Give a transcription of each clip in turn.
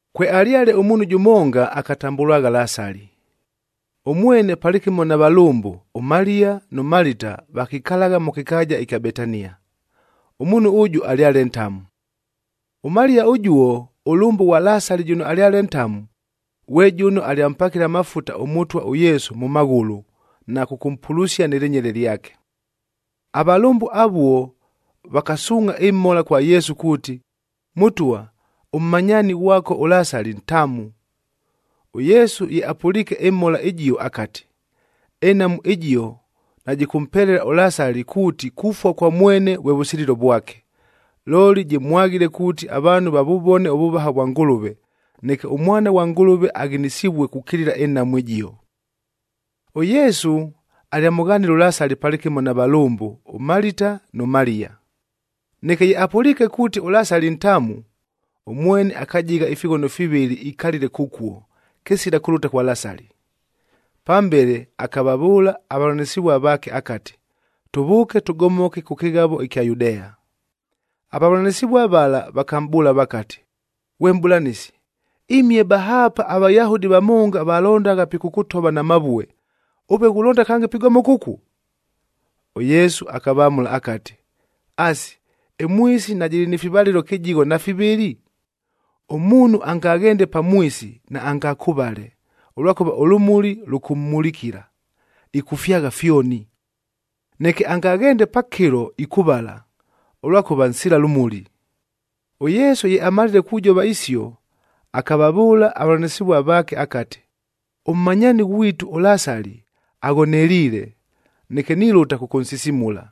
Kwealyale ʉmuunhu jʉmonga akatambʉlwagha Lasali. Ʉmwene palɨkɨmo na valʉmbʉ, ʉMaliya nʉ Malita vakikalagha mʉ kɨkaaja ɨkya Betania. Ʉmuunhu ʉjʉ alyale ntamu. ɄMaliya ʉjuo,a ʉlʉmbʉ ghwa Lasali jʉno alyale ntamu, ghwe jʉno alyampakile amafuta ʉMʉtwa ʉYesu mʉ maghʉlʉ, na kʉkʉmpulusia nɨ lɨnyele lyake. Avalʉmbʉ avuo vakasuungʼha ɨmhola kwa Yesu kuuti, “Mʉtwa, ʉmmanyaani ghwako ʉLasali ntamu.” ɄYesu ye apʉliike ɨmhola ɨjio akati, “Ɨnhamu ɨjio najɨkʉmpelela ʉLasali kuuti kufua kwa mwene vwe vʉsililo vwake, looli jɨmwaghile kuuti avaanhu vavʉvone ʉvʉvaha vwa Ngʉlʉve, neke ʉMwana ghwa Ngʉlʉve aghinisivue kukilila ɨnhamu ɨjio.” ɄYesu alyamʉghanile ʉLasali palɨkɨmo na valʉmbʉ, ʉMalita nʉ Maliya. Neke ye apʉliike kuuti ʉLasali ntamu, ʉmwene akajigha ifighono fivɨlɨ ikalile kʉkuo, kɨsila kʉlʉta kwa Lasali. Pambele akavavʉʉla avavʉlanɨsɨvua vaake akati, “Tʉvʉʉke tʉgomoke kʉ kɨghavo ɨkya Yudea.” Avavʉlanɨsɨvua vala vakamʼbʉʉla vakati, “Ghwe Mʼbʉlanɨsi, imihe bahaapa aVayahudi vamonga valondagha pikʉkʉtova na mavue, ʉve ghulonda kange pigomoka ʉkuo?” ɄYesu akavamʉla akati, “Asi, ɨmwisi najɨlɨ ni fivalɨlo kɨjigho na fivɨlɨ? Ʉmuunhu angaghende pamwisi, naangakʉvale, ʉlwakʉva ʉlʉmuli lukummulikila, ɨkʉfyagha fyoni. Neke angaghende pakɨlo ikʉvala, ʉlwakʉva nsila lʉmuli.” ɄYesu ye amalile kujova isio, akavavʉʉla avavʉlanɨsɨvua vaake akati, “Ʉmmanyaani ghwitu ʉLasali aghoneliile, neke nilʉta kʉkʉnsisimula.”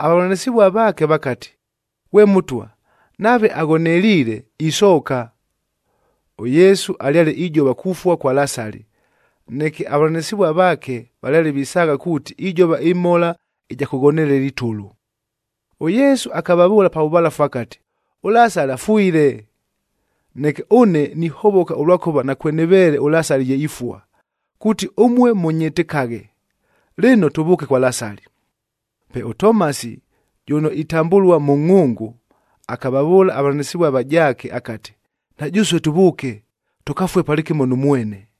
Avavʉlanɨsɨvua vaake vakati, “Ghwe Mʉtwa, nave aghoneliile, isooka.” ɄYesu alyale ijova kufua kwa Lasali, neke avavʉlanɨsɨvua vaake valyale visaagha kuuti ijova ɨmhola ɨja kʉghonelela itʉlʉ. ɄYesu akavavʉʉla pa vʉvalafu akati, “ɄLasali afwile. Neke ʉne nihovoka ʉlwakʉva nakwenɨveele ʉLasali ye ifua, kuuti ʉmue mʉnyɨtɨkaghe. Lɨno, tʉvʉʉke kwa Lasali.” Pe ʉTomasi jʉno itambʉlua Mʉngʼhʉngʉ, akavavʉʉla avavʉlanɨsɨvua avajaake akati, “Na jʉsue tʉvʉʉke, tʉkafue palɨkɨmo nʉ mwene.”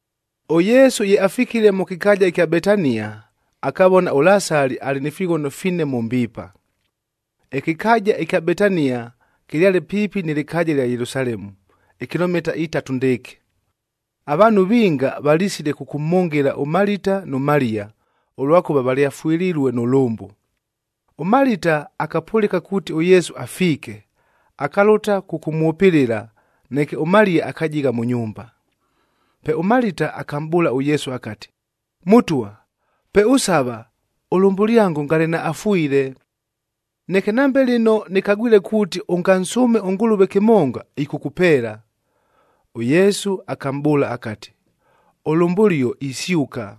ɄYesu ye afikile mʉ kɨkaaja ɨkya Betania, akavona ʉLasali alɨ ni fighono fine mʉ mbiipa. Ɨkɨkaaja ɨkya Betania kɨlyale piipi nɨ lɨkaaja ɨlya Yelusalemu, ikilomita itatu ndɨɨkɨ. Avaanhu vinga valisile kʉkʉmhʉngɨla ʉMalita nʉ Maliya, ʉlwakʉva valyafwɨlilue nʉ lʉmbʉ. ɄMalita akapʉlɨka kuuti ʉYesu afiike, akalʉta kʉkʉmwʉpɨlɨla, neke ʉMaliya akajigha mʉ nyumba. Pe ʉMalita akamʼbʉʉla ʉYesu akati, “Mʉtwa, peʉsava, ʉlʉmbʉlyango ngale naafwile. Neke nambe lɨno nɨkagwile kuuti ʉngansʉʉme ʉNgʉlʉve kɨmonga, ɨkʉkʉpeela.” ɄYesu akamʼbʉʉla akati, “Ʉlʉmbʉlio isyʉka.”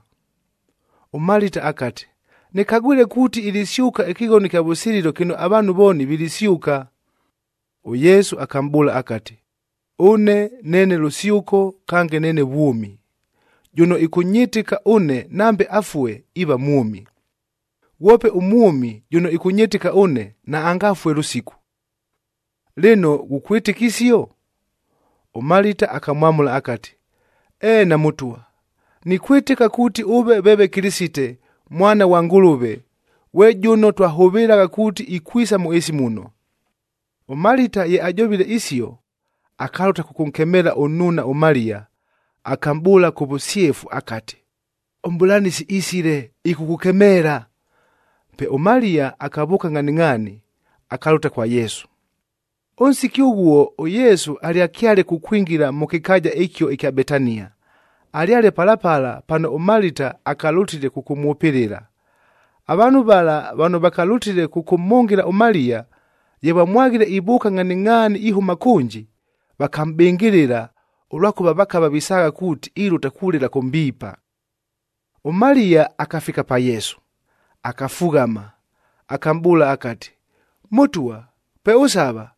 ɄMalita akati, “Nɨkagwile kuuti ilisyʉka ɨkɨghono ɨkya vʉsililo kɨno avaanhu vooni vilisyʉka.” ɄYesu akamʼbʉʉla akati, “Ʉne neene lʉsyʉko kange neene vwʉmi. Jʉno ɨkʉnyɨtɨka ʉne, nambe afue, iiva mwʉmi. Ghwope ʉmwʉmi jʉno ɨkʉnyɨtɨka ʉne, naangafue lʉsiku. Lɨno ghukwɨtɨka isio?” ɄMalita akamwamʉla akati, “Eena Mʉtwa, nikwɨtɨka kuuti ʉve veeve Kɨlɨsite, Mwana ghwa Ngʉlʉve, ghwe jʉno twahʉvɨlagha kuuti ikwisa mʉ ɨɨsi muno.” ɄMalita ye ajovile isio, akalʉta kʉkʉnkemeela ʉnnuuna ʉMaliya, akamʼbʉʉla kʉ vʉsyefu akati, “ɄMʼbʉlanɨsi isile, ɨkʉkʉkemeela.” Pe ʉMaliya akavʉʉka ngʼhaningʼhaani, akalʉta kwa Yesu. Ʉnsiki ʉghuo ʉYesu alyakyale kukwingila mʉ kɨkaaja ɨkio ɨkya Betania, alyale pala pala pano ʉMalita akalʉtile kʉkʉmwʉpɨlɨla. Avaanhu vala vano vakalʉtile kʉkʉmhʉngɨla ʉMaliya, ye vamwaghile ivʉʉka ngʼhaningʼhaani ihʉma kʉnji, vakamʼbɨngɨlɨla ʉlwakʉva vakava visaagha kuuti, ilʉta kulɨla kʉ mbiipa. ɄMaliya akafika pa Yesu, akafughama, akamʼbʉʉla akati, “Mʉtwa, peʉsava,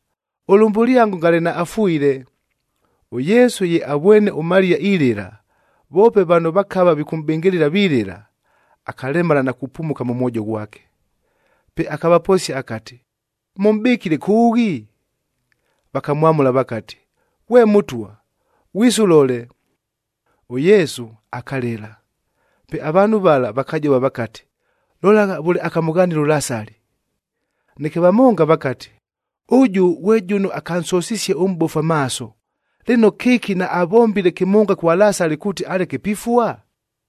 ʉlʉmbʉlyango ngale naafwile.” ɄYesu ye avwene ʉMaliya ilɨla, voope vano vakava vikʉmʼbɨngɨlɨla vilɨla, akalemala na kupumuka mʉ mwojo ghwake. Pe akavaposia akati, “Mʉmʼbɨkile kʉʉghi?” Vakamwamʉla vakati, “Ghwe Mʉtwa, ghwise ʉlole.” ɄYesu akalɨla. Pe avaanhu vala vakajova vakati, “Lolagha vʉle akamʉghanile ʉLasali!” Neke vamonga vakati, “Ʉjʉ ghwe jʉno akansosisie ʉmʼbofu amaaso. Lɨno, kɨki naavombile kɨmonga kwa Lasali kuuti aleke pifua?”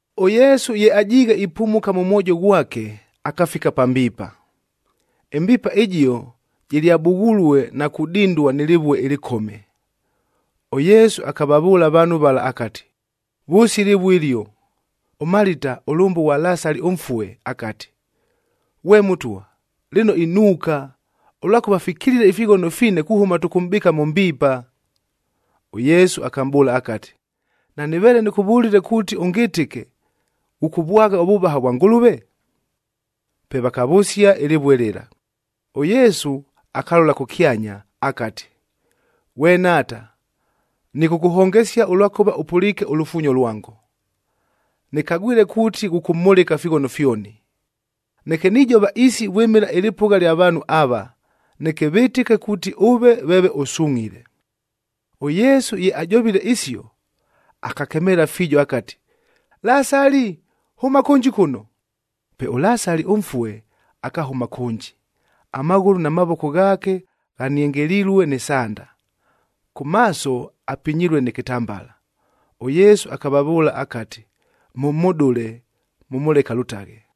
ɄYesu ye ajiighe ipumuka mʉ mwojo ghwake, akafika pa mbiipa. Ɨmbiipa ɨjio jɨlyabughulue na kudindua nɨ lɨvue ɨlɨkome. ɄYesu akavavʉʉla avaanhu vala akati, “Vʉsia ɨlɨvue ɨlio.” ɄMalita ʉlʉmbʉ ghwa Lasali ʉmfue akati, “Ghwe Mʉtwa, lɨno inuuka, ʉlwakʉva fikilile ifighono fine kuhʉma tʉkʉmʼbɨɨka mʉ mbiipa.” ɄYesu akamʼbʉʉla akati, “Nanɨveele nɨkʉvʉlile kuuti ʉngɨtɨke, ghʉkʉvwagha ʉvʉvaha vwa Ngʉlʉve?” Pe vakavʉsia ɨlɨvue lɨla. ɄYesu akalola kʉkyanya akati, “Ghwe Nhaata, nɨkʉkʉhongesia ʉlwakʉva ʉpʉliike ʉlufuunyo lwango. Nɨkagwile kuuti ghʉkʉmhʉlɨka ifighono fyoni, neke nijova isi vwɨmɨla ɨlɨpʉgha lya vaanhu ava, neke vɨtɨke kuuti ʉve veeve ʉsungʼhile.” ɄYesu ye ajovile isio, akakemeela fiijo akati, “Lasali, hʉma kʉnji kʉno!” Pe ʉLasali ʉmfue, akahʉma kʉnji, amaghʉlʉ na mavoko ghaake ghaniengelilue nɨ sanda, kʉ maaso apinyilue nɨ kɨtambala. ɄYesu akavavʉʉla akati, “Mʉmhʉdʉle, mʉmʉleke alʉtaghe.”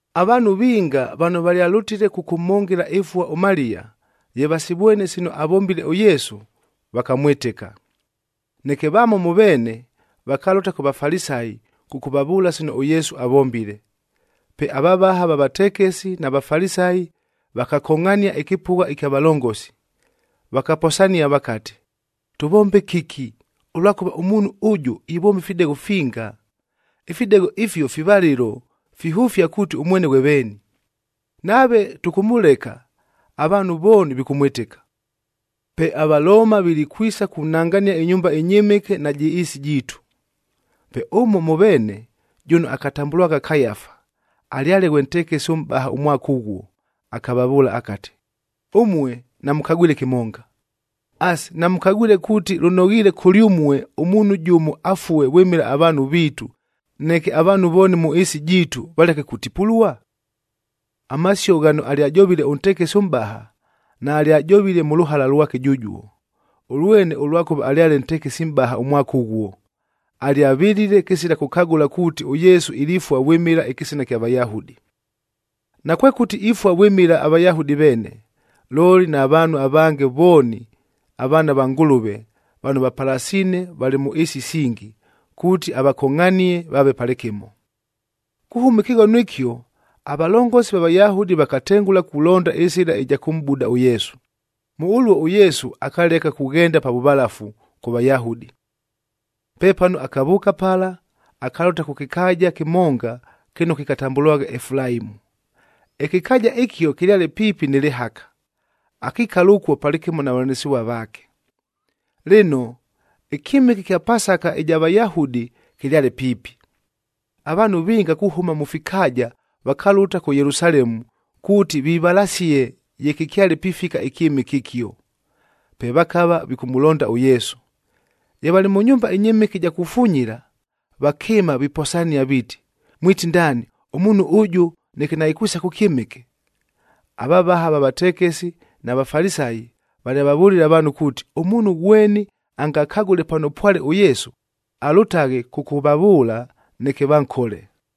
Avaanhu vinga vano valyalʉtile kʉkʉmhʉngɨla ɨfua ʉMaliya, ye vasivwene sino avombile ʉYesu, vakamwɨtɨka. Neke vamo mʉ veene vakalʉta kʉ Vafalisayi kʉkʉvavʉʉla sino ʉYesu avombile. Pe avavaha va vatekesi na Vafalisayi vakakongʼhania ɨkɨpʉgha ɨkya valongosi,b vakaposania vakati, “Tʉvombe kɨki, ʉlwakʉva ʉmuunhu ʉjʉ ivomba ifidegho finga! Ifidegho ifio fivalɨlo, fihʉfia kuuti ʉmwene ghwe veeni. Nave tʉkʉmʉleka, avaanhu vooni vikʉmwɨtɨka. Pe aValooma vilikwisa kunangania ɨnyumba ɨnyɨmɨke najɨ ɨɨsi jiitu.” Pe ʉmo mʉ veene, jʉno akatambʉlwagha Kayafa, alyale ghwe ntekesi ʉmʼbahac ʉmwaka ʉghuo, akavavʉʉla akati, “Ʉmue namʉkagwile kɨmonga! Asi, namʉkagwile kuuti lʉnoghiile kʉlyʉmue ʉmuunhu jʉmo afue vwɨmɨla avaanhu viitu, neke avaanhu vooni mʉ ɨɨsi jiitu valeke kutipulua?” Amasio ghano alyajovile ʉntekesi ʉmʼbaha, naalyajovile mʉ lʉhala lwake jʉjuo. Ʉlwene ʉlwakʉva alyale ntekesi mʼbaha ʉmwaka ʉghuo, alyavɨlile kɨsila kʉkagʉla kuuti ʉYesu ilifua vwɨmɨla ɨkɨsina ɨkya Vayahudi. Nakwekʉti ifua vwɨmɨla aVayahudi veene, looli na vaanhu avange vooni avaana va Ngʉlʉve vano vapalasiine valɨ mʉ ɨɨsi isingi, kuuti avakongʼhanie vaave palɨkɨmo. Kuhʉma ɨkɨghono ɨkio, avalongosi va Vayahudi vakatengʉla kulonda ɨsɨla ɨja kʉmʼbuda ʉYesu. Mʉ ʉluo ʉYesu akaleka kughenda pa vʉvalafu kʉ Vayahudi. Pepano akavʉʉka pala akalʉta kʉ kɨkaaja kɨmonga kɨno kɨkatambʉlwagha Efulaimu. Ɨkɨkaaja ɨkio kɨlyale piipi nɨ lɨhaka, akikala ʉkuo palɨkɨmo na vavʉlanɨsɨvua vaake. Lɨno, ɨkyɨmɨke ɨkya Pasaka ɨja Vayahudi kɨlyale piipi. Avaanhu vinga kuhʉma mʉ fikaaja vakalʉta kʉ Yelusalemu kuuti vivalasied ye kɨkyale pifika ɨkyɨmɨke ɨkio. Pe vakava vikʉmʉlonda ʉYesu. Ye valɨ mʉ nyumba ɨnyɨmɨke ɨja kufunyila, vakɨɨma viposania viiti, “Mwiti ndaani, ʉmuunhu ʉjʉ neke naikwisa kʉ kyɨmɨke!” Avavaha va vatekesi na Vafalisayi valyavavʉlile avaanhu kuuti, ʉmuunhu ghweni angakagʉle pano pwale ʉYesu, alʉtaghe kʉkʉvavʉʉla, neke vankole.